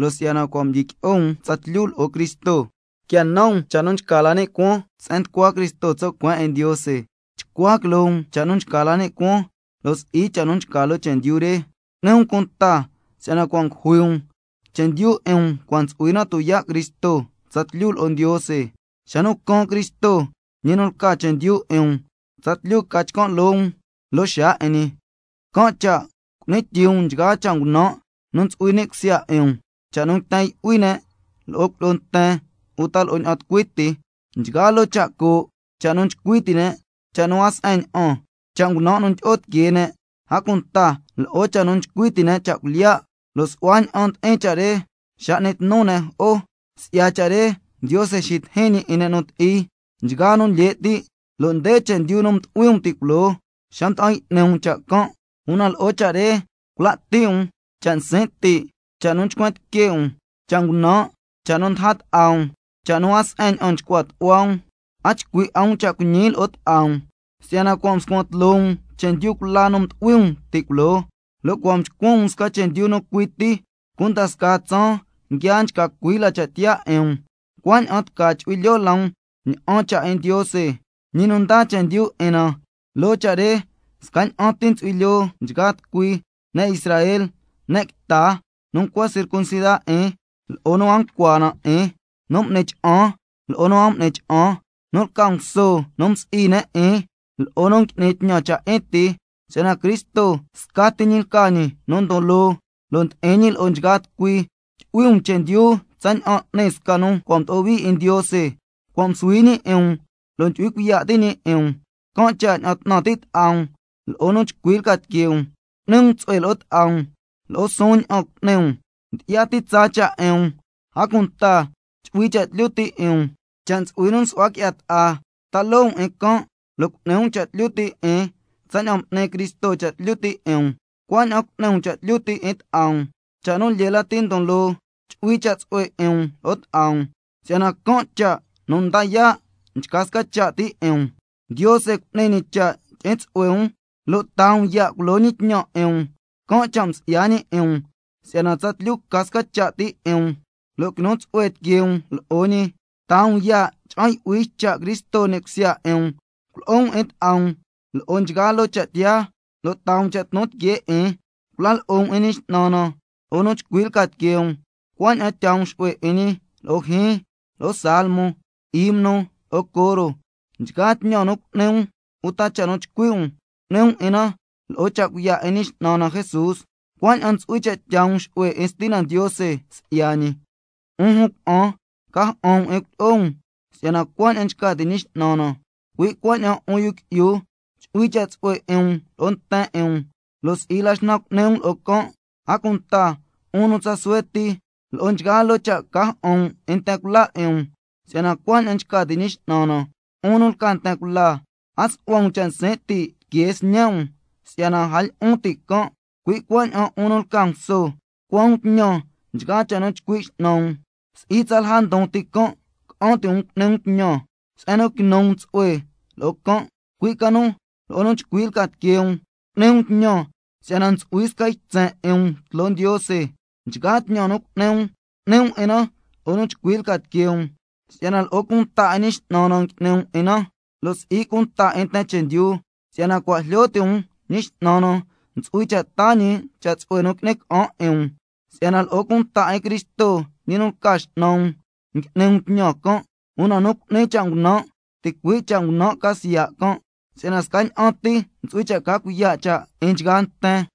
Si'yana cua' mdyiqui'o um tsatlyu lo'o Cristo, quia nan um cha' nu nchca la ni' cuaan se'en nducua Cristo tso' cueen 'in Ndiose. Chcua quiloo um cha' nu nchca la ni' cuaan, lo' si'i cha' nu nchca loo chendyu re. Cu'ni um cunta si'yana cua' ngujui um, chendyu 'in um cua' ntsu'hui na tuyaa' Cristo tsatlyu lo'o Ndiose. Xa nu caan Cristo, ñi nu lca chendyu 'in um, tsatlyu ca chcan' loo um lo'o ñi loo xaa 'in ñi. Can' cha' cu'ni tyii um nchgaa cha' ngunan' nu ntsu'hui ni' cusya 'in um: Cha' nu nguiten yu'hui ne' lo'o cuilyi'o nten uta lo'o ña'an tucui ti, nchgaa loo cha' coo', cha' nu nchcui ti' ne', cha' nu a se'en ña'an, cha' ngunan' nu ndyi'o tiquee ne', a cunta lo'o cha' nu nchcui ti' ne' cha' cuilyiya', lo' su'hua ña'an ndi'in cha' re xa n'ni tnu ne' jo'o. Si'ya cha' re Ndiose xitijin ñi 'in ne' nu ti'i, nchgaa nu lye' ti', lo' nde chendyu nu mdu'hui um ti' culoo xa mda'an y'ni um cha' can'. Una lo'o cha' re cula' ti' um: Cha' nsin' ti', cha' nu nchcuen tique' um, cha' ngunan', cha' nu ndaja ta'a um, cha' nu a se'en ña'an nchcua tu'hua um. A chcui' 'a um cha' cuiñi lo'o ta'a um, si'yana cua' mscuan tloo um chendyu cula nu mdu'hui um ti' culoo, lo' cua' mchcuan um sca chendyu nu cui ti, cunda sca tsaan nguia nchca cui la cha' tiyaa 'in um, cuaña'an tca chu'hui lyoo la um ña'an cha' 'in Ndiose, ñi nu ndaa chendyu 'in na. Loo cha' re scaña'an ti ntsu'hui lyoo nchgaa tucui: Ne' Israel, ne' quita, nu ncua circuncida 'in lo'o nu a ncua na 'in, nu m'ni cha'an lo'o nu a m'ni cha'an, nu lca nguso nu cua' msi'i ne' 'in lo'o nu ngui'ni tñan cha' 'in ti, si'yana Cristo scati ñi lca ñi nu ndon loo, lo' ndi'in ñi lo'o nchgaa tucui. Tyu'hui um chendyu tsaña'an n'ni sca nu cua' mdo'o hui 'in Ndiose, cua' msuhui ñi 'in um lo' ndyu'hui cuiya' ti' ñi 'in um, can' cha' ña'an 'tnan ti' ta'a um lo'o nu chcui lca tiquee um, cu'ni um tsu'hue lo'o ta'a um, lo'o suun ña'an cu'ni um, ndyi'ya ti tsaa cha' 'in um, a cunta chu'hui cha' tlyu ti' 'in um. Cha' ntsu'hui nu nsu'hua qui'ya ta'a, ta loo um 'in can', lo' cu'ni um cha' tlyu ti' 'in. Tsaña'an m'ni Cristo cha' tlyu ti' 'in um, cuaña'an cu'ni um cha' tlyu ti' 'in ta'a um. Cha' nu lyee lati ndon loo chu'hui cha' tsu'hue 'in um scasca um, si'yana can' cha' nu nda yaa' nchca sca cha' ti 'in um. Ndiose cu'ni ñi cha' tyi'in tsu'hue um lo' taa um ya' culo ñi tñan 'in um, can' cha' msi'ya ñi 'in um si'yana tsatlyu ca sca cha' ti' 'in um lo' quinu tsu'hue tiquee um lo'o ñi. Tyaa um ya' cha'an yu'hui ycha' Cristo ni' cusya 'in um, culo'o um 'in ta'a um lo'o nchgaa loo cha' tiyaa, lo' taa um cha' tnu tiquee 'in, cula lo'o um 'in Ñi X'nan na lo'o nu chcui lca tiquee um, cuaña'an tyaa um xu'hue 'in ñi lo'o scasca jyiin, lo'o salmo, himno, lo'o coro. Nchgaa tñan nu cu'ni um uta cha' nu chcui' um, cu'ni um 'in na lo'o cha' cuiya' 'in Ñi X'nan na Jesús, cuaña'an ntsu'hui cha' tyaa um xu'hue 'in Stina Ndiose si'ya ñi. 'Un jun cuna'an, ca ja'an um 'in cuilyi'o um si'yana cuaña'an nchca ti' Ñi X'nan na. Cui' cuaña'an 'un yu qui'yu, chu'hui cha' tsu'hue 'in um lo'o nten 'in um, lo' si'i la xnan cu'ni um lo'o can'. A cunta 'un nu tsa suhue ti, nchgaa cha' ca ja'an um 'in nten cula 'in um, si'yana cuaña'an nchca ti' Ñi X'nan na. 'Un nu lca nten cula, a su'hua um cha' nsin' ti' tiquee sñe' um si'yana a lyi'un ti' can'. Cui' cuaña'an 'un nu lca nguso, tucua um tñan nchgaa cha' nu chcui' x'nan um, si'i tsalja ndon ti can' ca'an ti' um cu'ni um tñan se'en nu quinu um tsu'hue lo'o can', cui' ca nu lo'o nu chcui lca tiquee um cu'ni um tñan si'yana ntsu'hui sca ytsen 'in um tloo Ndiose. Nchgaa tñan nu cu'ni um, cu'ni um 'in na lo'o nu chcui lca tiquee um, si'yana lo'o cunta 'in Ñi X'nan na ngui'ni um 'in na, lo' si'i cunta 'in nten chendyu. Si'yana cua' jlyo ti' um Ñi X'nan na ntsu'hui cha' taa ñi cha' tsu'hue nu qui'ni ca'an 'in um, si'yana lo'o cunta 'in Cristo ñi nu lca X'nan um ngui'ni um tñan can'. Una nu cu'ni cha' ngunan' ticui' cha' ngunan' ca siya' can', si'yana scaña'an ti ntsu'hui cha' ca cuiya' cha' 'in nchgaa nten.